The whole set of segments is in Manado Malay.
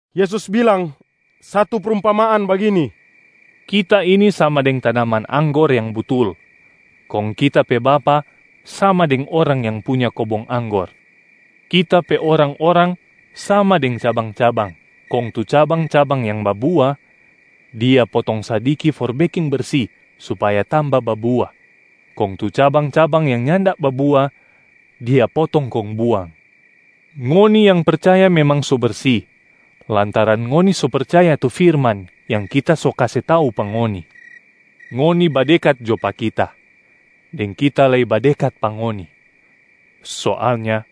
Yesus bilang satu prumpamaan bagini, “Kita ini sama deng tanaman anggor yang butul, kong Kita pe Bapa sama deng orang yang punya kobong anggor. Kita pe orang-orang sama deng cabang-cabang, kong tu cabang-cabang yang babua, Dia potong sadiki for beking bersi supaya tamba babua, kong tu cabang-cabang yang nyanda babua, Dia potong kong buang. Ngoni yang percaya memang so bersi lantaran ngoni so percaya tu firman yang Kita so kase tau pa ngoni. Ngoni badekat jo pa Kita, deng Kita lei badekat pa ngoni. Soalnya,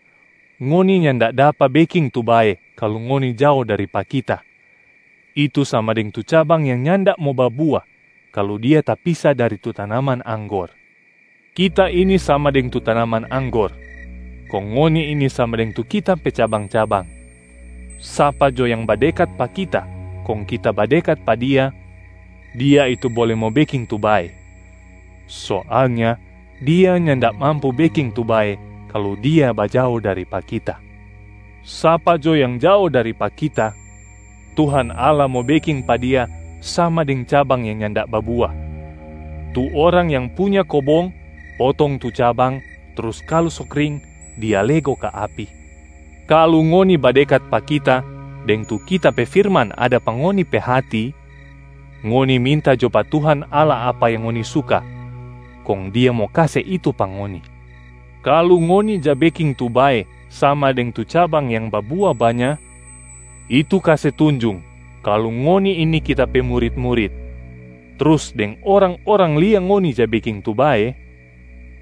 ngoni nyanda dapa beking tu bae kalu ngoni jao dari pa Kita, itu sama deng tu cabang yang nyanda mo babua kalu dia tapisa dari tu tanaman anggor. Kita ini sama deng tu tanaman anggor kong ngoni ini sama deng tu Kita pe cabang-cabang. Sapa jo yang badekat pa Kita kong Kita badekat pa dia, dia itu bole mo beking tu bae. Soalnya dia nyanda mampu beking tu bae kalu dia bajao dari pa Kita. Sapa jo yang jao dari pa Kita, Tuhan Allah mo beking pa dia sama deng cabang yang nyanda babua, tu orang yang punya kobong potong tu cabang trus kalu so kring dia lego ka api. Kalu ngoni badekat pa Kita deng tu Kita pe firman ada pa ngoni pe hati, ngoni minta jo pa Tuhan Allah apa yang ngoni suka kong Dia mo kase itu pa ngoni. Kalu ngoni ja beking tu bae sama deng tu cabang yang babua banya, itu kase tunjung kalu ngoni ini Kita pe murit-murit, trus deng orang-orang lia ngoni ja beking tu bae,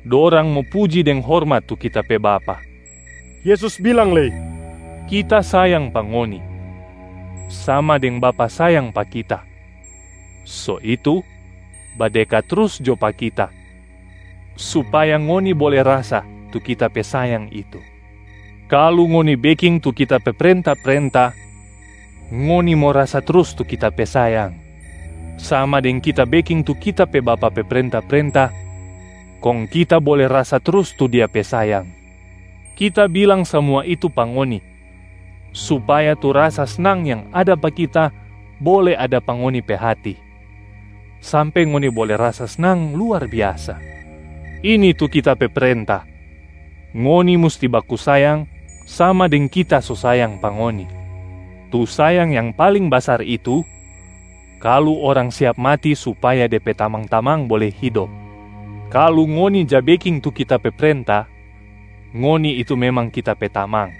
dorang mo puji deng hormat tu Kita pe Bapa.” Yesus bilang lei, “Kita sayang pa ngoni, sama deng Bapa sayang pa Kita. So itu, badekat trus jo pa Kita supaya ngoni bole rasa tu Kita pe sayang itu. Kalu ngoni beking tu Kita pe prenta-prenta, ngoni mo rasa trus tu Kita pe sayang, sama deng Kita beking tu Kita pe Bapa pe prenta-prenta kong Kita bole rasa trus tu Dia pe sayang. Kita bilang samua itu pa ngoni, supaya tu rasa snang yang ada pa Kita bole ada pa ngoni pe hati, sampe ngoni bole rasa snang luar biasa. Ini tu Kita pe prenta: ngoni musti baku sayang sama deng Kita so sayang pa ngoni. Tu sayang yang paling basar itu, kalu orang siap mati supaya de pe tamang-tamang bole hidop. Kalu ngoni ja beking tu Kita pe prenta, ngoni itu memang Kita pe tamang.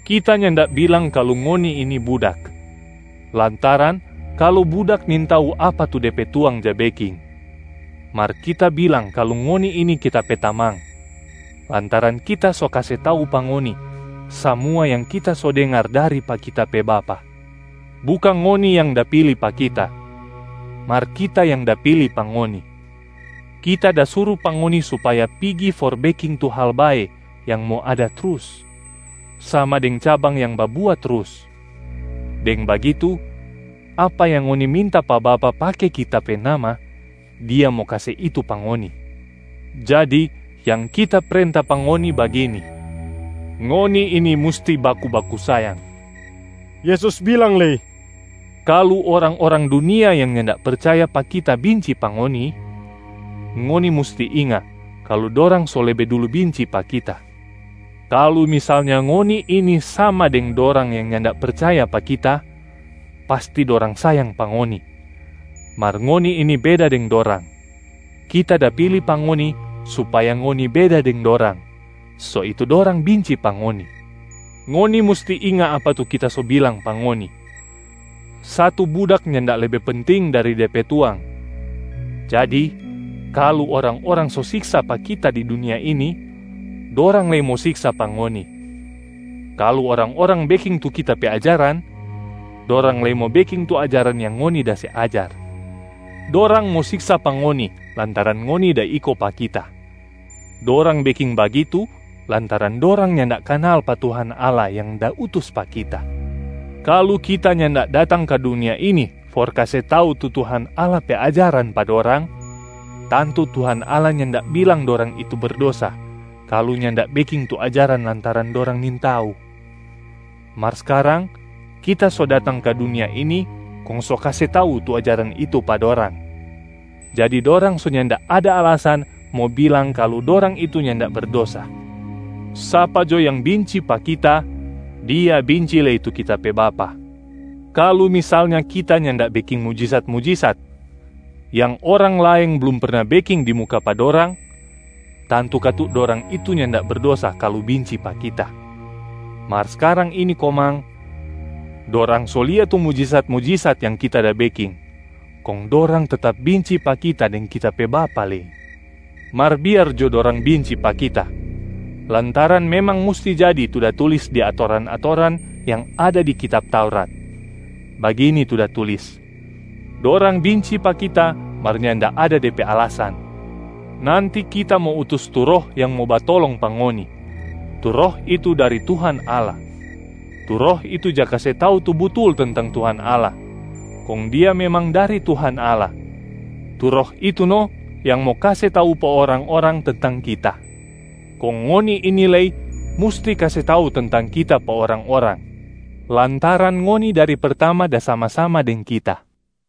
Kita nyanda bilang kalu ngoni ini budak, lantaran kalu budak nintau apa tu de pe tuang ja beking. Mar Kita bilang kalu ngoni ini Kita pe tamang, lantaran Kita so kase tau pa ngoni samua yang Kita so dengar dari pa Kita pe Bapa. Bukang ngoni yang da pili pa Kita, mar Kita yang da pili pa ngoni. Kita da suru pa ngoni supaya pigi for beking tu hal bae yang mo ada trus, sama deng cabang yang babua trus. Deng bagitu, apa yang ngoni minta pa Bapa pake Kita pe nama, Dia mo kase itu pa ngoni. Jadi yang Kita prenta pa ngoni bagini: ngoni ini musti baku-baku sayang.” Yesus bilang lei, “Kalu orang-orang dunia yang nyanda percaya pa Kita binci pa ngoni, ngoni musti inga kalu dorang so lebe dulu binci pa Kita. Kalu misalnya ngoni ini sama deng dorang yang nyanda percaya pa Kita, pasti dorang sayang pa ngoni. Mar ngoni ini beda deng dorang. Kita da pili pa ngoni supaya ngoni beda deng dorang, so itu dorang binci pa ngoni. Ngoni musti inga apa tu Kita so bilang pa ngoni: satu budak nyanda lebe penting dari de pe tuang. Jadi, kalu orang-orang so siksa pa Kita di dunia ini, dorang lei mo siksa pa ngoni. Kalu orang-orang beking tu Kita pe ajaran, dorang lei mo beking tu ajaran yang ngoni da se ajar. Dorang mo siksa pa ngoni lantaran ngoni da iko pa Kita. Dorang beking bagitu lantaran dorang nyanda kanal pa Tuhan Allah yang da utus pa Kita. Kalu Kita nyanda datang ka dunia ini for kase tau tu Tuhan Allah pe ajaran pa dorang, tantu Tuhan Allah nyanda bilang dorang itu berdosa kalu nyanda beking tu ajaran lantaran dorang nintau. Mar skarang Kita so datang ka dunia ini kong so kase tau tu ajaran itu pa dorang, jadi dorang so nyanda ada alasan mo bilang kalu dorang itu nyanda berdosa. Sapa jo yang binci pa Kita, dia binci lei tu Kita pe Bapa. Kalu misalnya Kita nyanda beking mujisat-mujisat yang orang laeng blum perna beking di muka pa dorang, tantu katu dorang itu nyanda berdosa kalu binci pa Kita. Mar skarang ini komang, dorang so lia tu mujisat-mujisat yang Kita da beking, kong dorang tetap binci pa Kita deng Kita pe Bapa lei. Mar biar jo dorang binci pa Kita, lantaran memang musti jadi tu da tulis di atoran-atoran yang ada di kitab Taurat. Bagini tu da tulis, ‘Dorang binci pa Kita mar nyanda ada de pe alasan.’ Nanti Kita mo utus tu Roh yang mo batolong pa ngoni, tu Roh itu dari Tuhan Allah. Tu Roh itu ja kase tau tu butul tentang Tuhan Allah, kong Dia memang dari Tuhan Allah. Tu Roh itu no yang mo kase tau pa orang-orang tentang Kita. Kong ngoni ini lei musti kase tau tentang Kita pa orang-orang lantaran ngoni dari pertama da sama-sama deng Kita.”